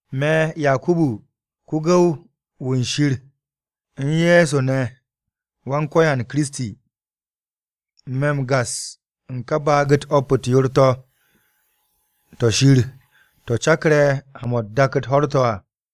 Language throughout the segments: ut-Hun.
Me̱ Yakubu, ko-gu̱w-wu̱ Shir u̱n Ye̱so ne̱ Wan-Ko̱yan Kiristi. Me̱ m-gas u̱n ka baag-u̱t o̱p-u̱t yoor-to̱, to̱ Shir to̱ cakre̱ ha-mo̱ u̱n dak-u̱t ho̱r-to̱ à.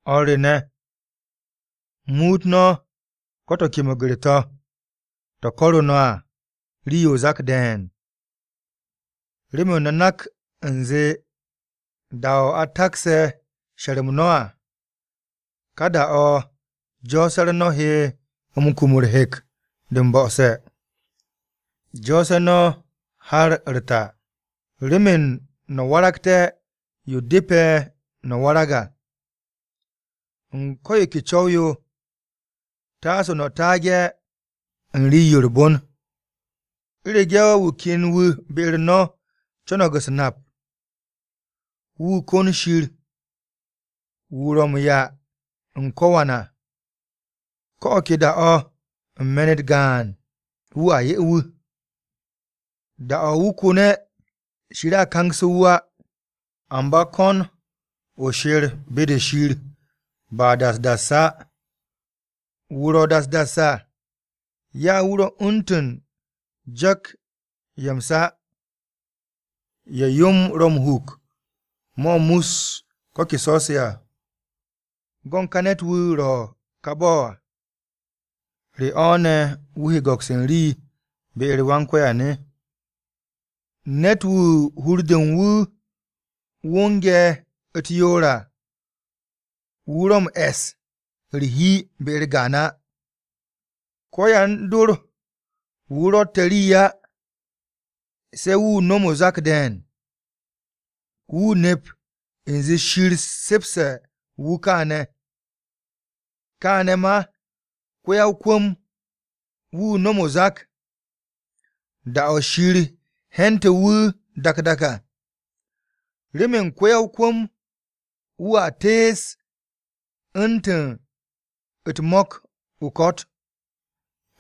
O̱r re ne̱, muut no̱ ko̱ to̱ ke meger-to̱ to̱ ko̱ru̱ no̱ à, rii-yo o-zak de̱e̱n. Remen no̱ nak u̱nze da-o̱ a takse̱ she̱r-m no̱ à, ka da-o̱ jo̱o̱se̱-u̱r no̱ he kum u̱r-hek de m-bo̱'o̱se̱. Jo̱o̱se̱ no̱ har u̱r-ta, remen no̱ waragté̱ yo depe̱ no̱ warag à u̱n ko̱ yo ke co̱w-yo, taase no̱ taage̱ u̱n rii-yo u̱r-bon. U̱rege̱ wu̱ ken wu̱ be-u̱r no̱ co̱no̱g u̱s-nap, wu̱ kon Shir wu̱ ro̱ m-'ya u̱n ko̱wan à, ko̱ o̱ ke da-o̱ u̱n me̱n-u̱t gaan, wu̱a 'ye wu̱. Da-o̱ wu̱ ko̱ne̱, Shir a kangsu̱ wu̱ á. Amba ko̱n o she̱r be-de Shir ba das das á. Wu̱ ro̱ das das à, ya wu̱ ro̱ u̱ntu̱n jo̱k-ye̱ m-sa, ye̱ yo-m ro̱ m-huk mo̱ mus ko̱ ke so̱-se à. Go̱n ka ne̱t-wu̱ ro̱ ka bo̱ à, ¿re o̱ ne̱ wu̱ he go̱ks u̱n rii be-u̱r Wan-Ko̱yan? Ne̱t-wu̱ hur-de u̱n wu̱ wonge̱ u̱t-yoor à, wu̱ ro̱ m-e̱s u̱r-hi be-u̱r gaan á. Ko-yan-dor-wu̱ ro̱tte̱ rii á, se̱ wu̱ nom o-zak de̱e̱n. Wu̱ nep u̱nze Shir se̱pse̱ wu̱ kaane̱. Kaane̱ ma, ko-ya-o-kwu̱m-wu̱ nom o-zak, da-o̱ Shir he̱nte̱ wu̱ dak dak à. Remen ko-ya-o-kwu̱m wu̱a tees u̱ntu̱ u̱t-mo̱k o-ko̱t.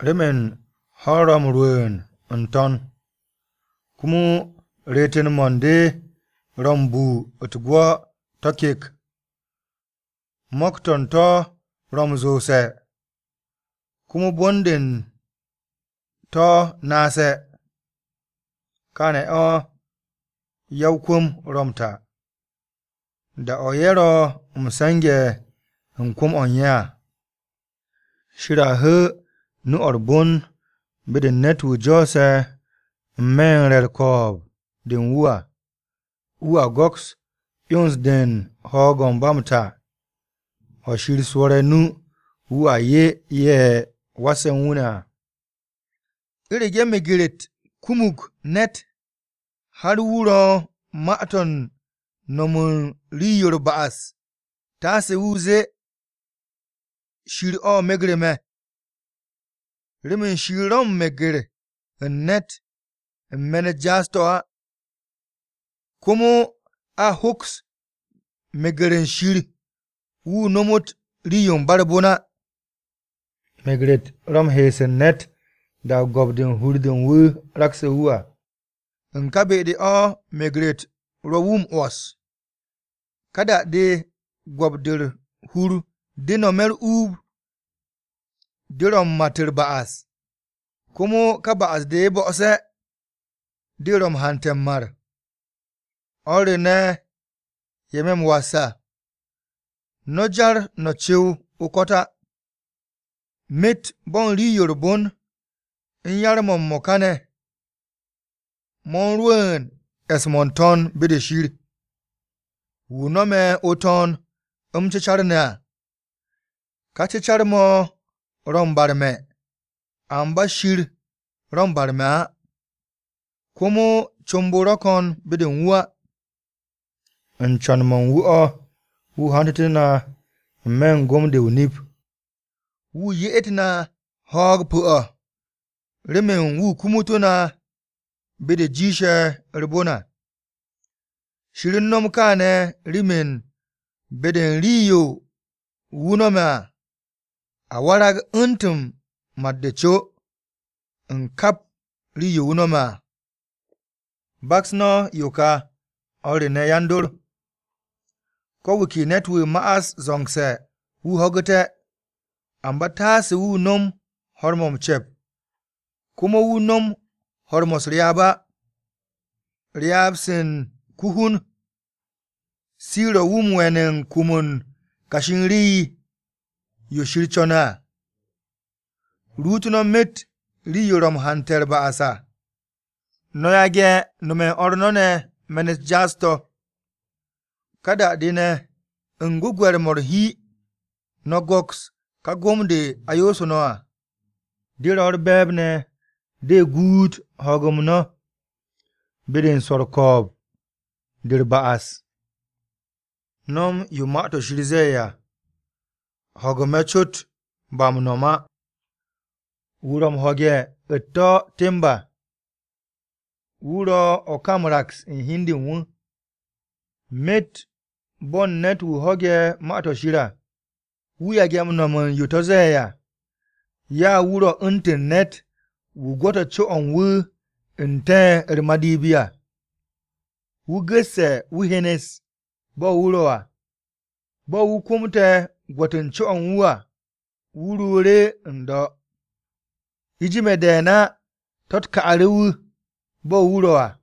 Remen ho̱-u̱r ro̱ rwu̱u̱n ne̱ n-to̱n, komo reeten-mo̱ u̱n de ro̱ m-bu u̱t-gwo̱ to̱ kek, mo̱k-to̱ u̱n to̱ ro̱ m-zoose̱, komo bon-de u̱n to̱ naase̱. Kaane̱ o̱ ya-o-kwu̱m ro̱ m-ta, da-o̱ ye̱ ro̱ m-se̱nge̱ u̱n kwu̱m-o̱ u̱n ye̱ à. Shir a hu̱u̱ nu-o̱ u̱r-bon be-de u̱n ne̱t-wu̱ jo̱o̱se̱ n-me̱ u̱n re̱ u̱r-ko̱o̱b de u̱n wu̱ à, wu̱a go̱ks 'yons-de u̱n ho̱o̱g-o̱ u̱n ba m-ta o̱ Shir swo̱re̱ o-nu wu̱a 'ye ye̱ wasse̱ u̱n wu̱ ne̱ à. U̱rege̱ meger-u̱t kumug ne̱t har wu̱ ro̱ u̱n ma-to̱ u̱n no̱m u̱n rii-yo u̱r-ba'as taase wu̱ zee, “Shir-o megre̱ me̱.” Remen Shir ro̱ u̱n meger u̱n ne̱t u̱n me̱n u̱t-jaas to̱ á, komo a hoks meger u̱n Shir wu̱ nomot rii-yo ba u̱r-bon á. Meger-u̱t ro̱ m-he̱e̱s u̱n ne̱t da-o̱ go̱p-de u̱r-hur de u̱n wu̱ rakse̱ wu̱ à, u̱n ka be-de o̱ meger-u̱t ro̱ wu̱ m-'wo̱s. Ka da-de go̱p-de u̱r-hur de nome̱ u̱r-uub, de ro̱ m-mat u̱r-ba'as, komo ka ba'as-de bo̱'o̱se̱, de ro̱ wu̱ m-hante̱ m-mar. O̱r re ne̱ ye̱ me̱ m-was à, no̱ jar no̱ cu̱w o-ko̱t á! Myet bo̱ u̱n rii-yo u̱r-bon u̱n yar-mo̱ m-mo̱ka ne̱, mo̱ u̱n rwu̱u̱n e̱s-mo̱ n-to̱n, be-de Shir. Wu̱ nome̱ o-To̱n m-cecar ne̱ à, ka cecar-mo̱ ro̱ m-barme̱ amba Shir ro̱ m-barme̱ á, komo comb-o ro̱ ko̱n be-de u̱n wu̱ á. U̱n co̱n-mo̱ u̱n wu̱ o̱, wu̱ hantu̱tu̱ na n-me̱ u̱n gom-de o-nip, wu̱ ye'et na ho̱o̱g pu̱-o̱ remen wu̱ kumutú̱ na be-de jiishe̱ u̱r-bon à. Shir u̱n no̱m kaane̱ remen be-de u̱n rii-yo wu̱ no̱me̱ à, a warag u̱ntu̱n mat-de o-co u̱n kap rii-yo wu̱ no̱me̱ à. Baks no̱ yo ka, o̱r re ne̱ yan-dor, Ko̱ wu̱ ke ne̱t-wu̱ ma'as zo̱ngse̱ wu̱ ho̱gu̱te̱, amba taase wu̱ nom ho̱r-mo̱ m-ce̱p komo wu̱ no̱m ho̱r-mo̱ u̱s-ryaab á. Ryaab-se u̱n ko-hun se ro̱ wu̱ m-we̱n u̱n kum u̱n kashi u̱n rii-yo Shir co̱ne̱ à. Ruut no̱ myet rii-yo ro̱ m-hante̱ u̱r-ba'as à, no̱ yage̱ nome̱ u̱n o̱r no̱ ne̱ me̱n-u̱t jaas-to̱. Ka da-de ne̱ u̱n gwu̱gwe̱r-mo̱ u̱r-hi, no̱ go̱ks ka gom-de a yoosu̱ no̱ à. De ro̱ u̱r-be̱e̱b ne̱ de guut ho̱o̱g-m no̱, be-de u̱n swo̱ u̱n ko̱o̱b-de u̱r-ba'as. No̱m yo Ma-to̱ Shir ze̱e̱ à, ho̱gu̱-mo̱ cot, ba m-nom á. Wu̱ ro̱ m-ho̱ge̱ u̱t-to̱ temb à, wu̱ ro̱ o̱ ka m-raks u̱n hi u̱n de u̱n wu̱. Myet bo̱ u̱n ne̱t-wu̱ ho̱ge̱ Ma-to̱ Shir à, wu̱ yage̱ m-no̱m u̱n yo to̱ ze̱e̱ à, ya wu̱ ro̱ u̱ntu̱n ne̱t-wu̱ gwo̱te̱ co-o̱ u̱n wu̱ n-te̱ u̱r-madipi à. Wu̱ gu̱sse̱ wu̱ hyenes bo̱ wu̱ ro̱ à, bo̱ wu̱ komte̱ gwo̱t u̱n co-o̱ u̱n wu̱ à, wu̱ ruuru̱ n-do̱. U̱jime̱ de̱e̱n á to̱-u̱t ka'u̱ru̱ wu̱ bo̱ wu̱ ro̱ à.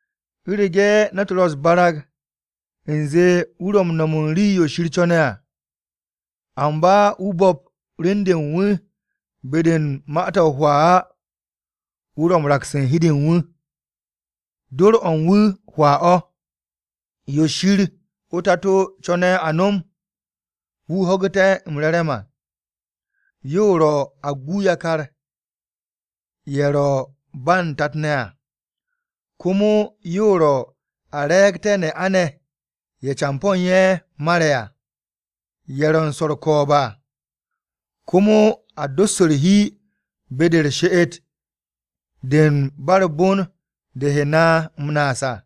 U̱rege̱ ne̱t ro̱ u̱s-barag u̱nze wu̱ ro̱ m-no̱m u̱n rii-yo Shir co̱ne̱ à, amba wu̱ bo̱p rem-de u̱n wu̱ be-de u̱n ma-to̱ hwaa á, wu̱ ro̱ u̱n raks u̱n hi u̱n de u̱n wu̱, dor-o u̱n wu̱ hwaa o̱. Yo Shir o-Tato co̱ne̱ a nom, wu̱ ho̱gu̱te̱ m-re̱re̱m à, yo ro̱ a gu yakar-ye̱ ro̱ ba u̱n tat-ne̱ à, komo yo ro̱ a re̱e̱gte̱ ne'a-ne̱ ye̱ campo̱-ne̱ ye̱ u̱n ye̱ mare̱ à, ye̱ ro̱ u̱n swo̱ u̱r-ko̱o̱b à. Komo a dos u̱r-hi be-de u̱n she'et-de u̱n ba u̱r-bon de he na m-naas à.